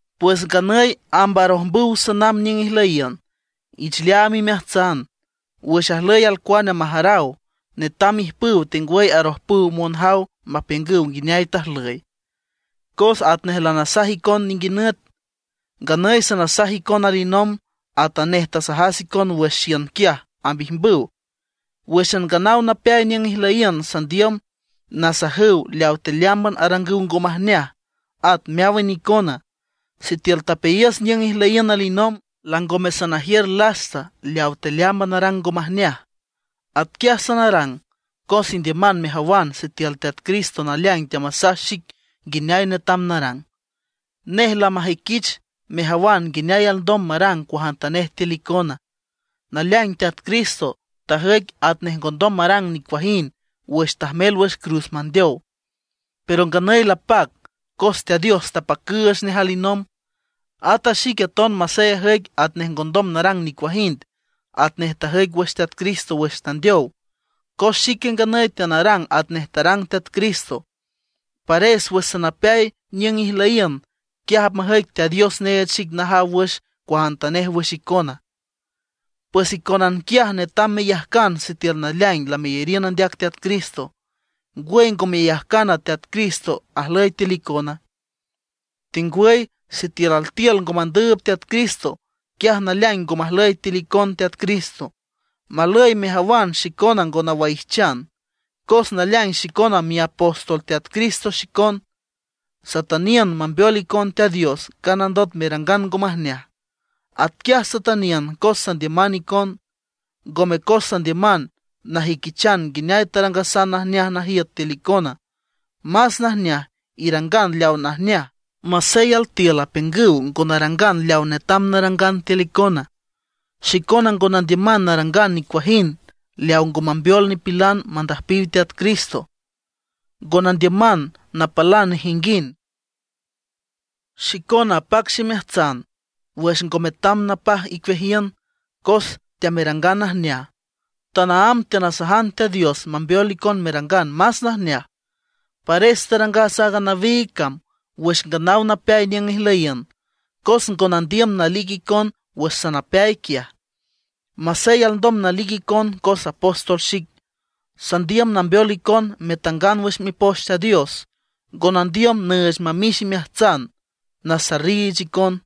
Pues nganüy amb arojmbüw sanamb niüng ijlüyiün. Ich leaam imeajtsan, wüx ajlüy alcuane majaraw, netam ijpüw tengwüy arojpüw monjaw mapiüngüw nguineay tajlüy. Cos atnej lanasaj icon ninguinüt, nganüy sanasaj icon alinomb atanej tasajas icon wüx xiün quiaj amb ijmbüw. Wǘxan nganaw napeay niüng ijlüyiün sandiüm nasajüw leaw tealeámban arangüw ngo majneaj, at meáwan icona, sitiül tapeayiüs niüng ijlüyiün alinomb, langome sanajiür lasta leaw tealeámban arang ngo majneaj. Atquiaj sanarang, cos indiüman mejawan sitiül Teat Cristo naleaing teamasaj xic nguineay netam narang. Nej lamajüiquich mejawan nguineay alndom marang cuajantanej tiül icona. Naleaing Teat Cristo tajüic atnej ngondom marang nicuajind wüx tajmel wüx cruz mandeow, pero nganüy lapac, cos Teat Dios tapacüüch nej alinomb. Ata xique aton masey ajüic atnej ngondom narang nicuajind, atnej tajüic wüx Teat Cristo wüx tandeow. Cos xique nganüy teanarang atnej tarang Teat Cristo, pares wüx sanapeay niüng ijlüyiün, quiaj apmajüic Teat Dios neech xic najaw wüx cuajantanej wüx icona. Pues icónan quiaj netam meyajcan sitiül naleaing lameyariün andeac Teat Cristo. ¿Ngwüy ngo meyajcana, Teat Cristo ajlüy tiül icona? Tengwüy sitiül altiül ngo mandüüb Teat Cristo, quiaj naleaing ngo majlüy tiül icon Teat Cristo. Malüy mejawan xicona ngo nawaijchan, cos naleaing xicona miapóstol Teat Cristo xicon. Satüniün mambeol icon Teat Dios nganandot merangan ngo majneaj. Atquiaj satüniün cos sandiüman icon, ngome cos sandiüman najüiquichan nguineay tarangasan najneaj najiüt tiül icona. Más najneaj, irangan leaw najneaj masey altiül apiüngüw ngo narangan leawa netam narangan tiül icona. Xicona ngo nandiüman narangan nicuajind leaw ngo mambeol nipilan mandüjpiw Teat Cristo, ngo nandiüman napalan nejinguind. Xicona apac ximeajtsan wüx ngo metam napaj icueajiün cos teamerangan najneaj. Tanaámb teanasajan Teat Dios mambeol icon merangan más najneaj. Pares tarangas aaga nawiig cam wüx nganaw napeay niüng ijlüyiün, cos ngo nandiüm nalic icon wüx sanapeay quiaj, masey alndom nalic icon cos apóstol xic. Sandiüm nambeol icon metangan wüx Mipoch Teat Dios; ngo nandiüm nüüch mamix imeajtsan, nasarriich icon.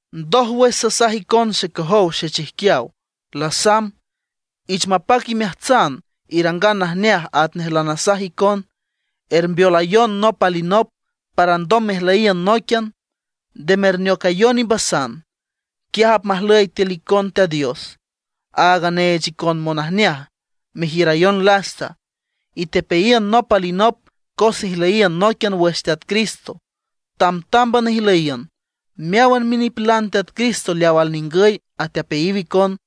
Ndójwüx sasaj icon xecojow xechijquiaw, lasamb. Ich mapac imeajtsan irangan najneaj atnej lanasaj icon, ermbeolayon nop alinop para alndom mejlüyiün nóiquian; nde merneocayon imbasan. Quiaj apmajlüy tiül icon Teat Dios, aaga neech icon monajneaj, merjiürayon lasta. Itepeayiün nop alinop cos ijlüyiün nóiquian wüx Teat Cristo. Tamtámban ijlüyiün. Meáwan minipilan Teat Cristo leaw alningüy atepeayiw icon.